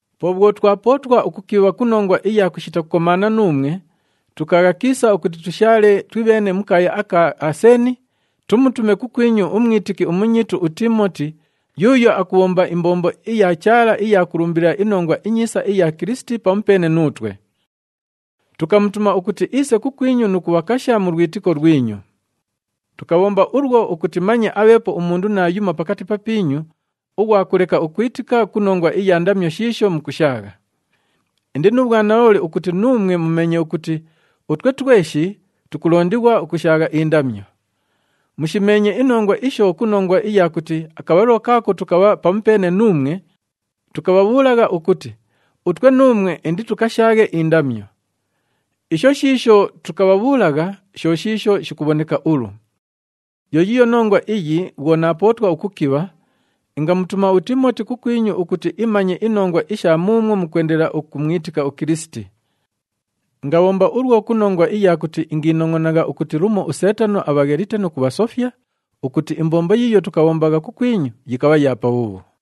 Po bhwo twapootwa ukukibha ku nongwa iya kushita kukomaana nuumwe, tukaagha kiisa ukuti tushaale twibheene mu kaaya aka Aseeni, tumutume kukwinyu umwitiki umunyiitu uTiimoti, yuuyo akubhomba imbombo iya Chaala iya kulumbilila iNongwa iNyiisa iya Kilisiti pamupeene nuutwe. Tukamutuma ukuti iise kukwinyu nu kubhakasha mu lwitiko lwinyu. Tukabhomba ulwo ukuti manye abheepo umundu naayumo pakati papiinyu ughwa kuleka ukwitika ku nongwa iya ndamyo shiisho mukushaagha. Indi nu bhwanalooli ukuti nuumwe mumeenye ukuti utwe tweshi tukulondighwa ukushaagha indamyo. Mushimeenye inongwa isho ku nongwa iya kuti akabhalilo kaako tukabha pamupeene nuumwe, tukabhabhuulagha ukuti utwe nuumwe inditukashaaghe indamyo. Isho shiisho tukabhabhuulagha, sho shiisho shikubhoneka ulu. Yo yiiyo nongwa iyi bhwo naapootwa ukukibha, ingamutuma uTiimoti kukwinyu ukuti imanye inongwa isha muumwo mukwendelela ukumwitika uKilisiti. Ingabhomba ulwo ku nongwa iya kuti ingiinongʼonagha ukuti lumo uSeetano abhaghelite nu kubhasofya, ukuti imbombo yiiyo tukayibhombagha kukwinyu yikabha ya pabhuubhu.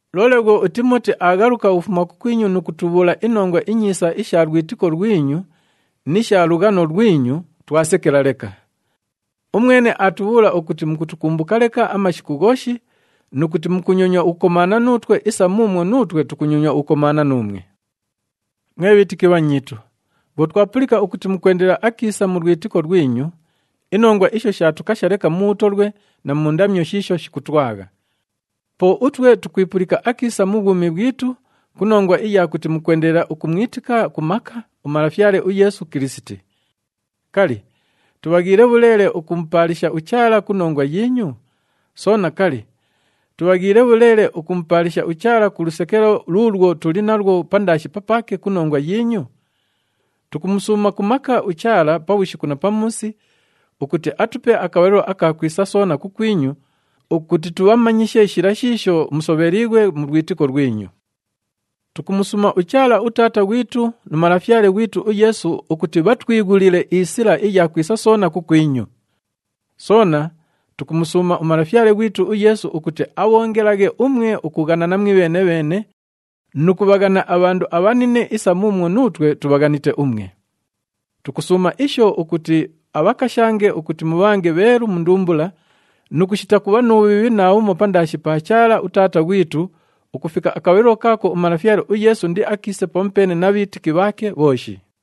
Loole bhwo uTiimoti aaghaluka ukufuma kukwinyu nu kutubhuula inongwa inyiisa isha lwitiko lwinyu ni sha lughano lwinyu, twasekela leka. Umwene aatubhuula ukuti mukutukumbuka leka amashiku ghooshi nu kuti mukunyonywa ukukomaana nuutwe isa muumwo nuutwe tukunyonywa ukukomaana nuumwe. Mwe bhiitiki bhanyiitu, bhwo twapulika ukuti mukwendelela akiisa mu lwitiko lwinyu, inongwa isho shaatukasha leka mu bhutolwe na mu ndamyo shiisho shikutwagha. Po utwe tukwipulika akiisa mu bhwumi bhwitu ku nongwa iya kuti mukwendelela ukumwitika ku maka uMalafyale uYeesu Kilisiti. Kali, tubhaghiile bhuleele ukumupaalisha uChaala ku nongwa yiinyu? Soona, kali, tubhaghiile bhuleele ukumupaalisha uChaala ku lusekelo luulwo tuli nalwo pandaashi papaake ku nongwa yiinyu? Tukumusuuma ku maka uChaala pabhushiku na pamuusi ukuti atupe akabhalilo aka kwisa soona kukwinyu ukuti tubhamanyishe shila shiisho musobheliighwe mu lwitiko lwinyu. Tukumusuuma uChaala uTaata ghwitu nu Malafyale ghwitu uYeesu ukuti bhatwighulile isila iya kwisa soona kukwinyu. Soona tukumusuuma uMalafyale ghwitu uYeesu ukuti abhoongelaghe umwe ukughanana mwibheene-bheene nu kubhaghana abhandu abhanine isa muumwo nuutwe tubhaghanite umwe. Tukusuuma isho ukuti abhakashange ukuti mubhange bheelu mu ndumbula nu kushita kubha nu bhubhiibhi naabhumo pandaashi pa Chaala uTaata ghwitu ukufika akabhalilo kaako uMalafyale uYeesu indiakiise pamupeene na bhiitiki bhaake bhooshi.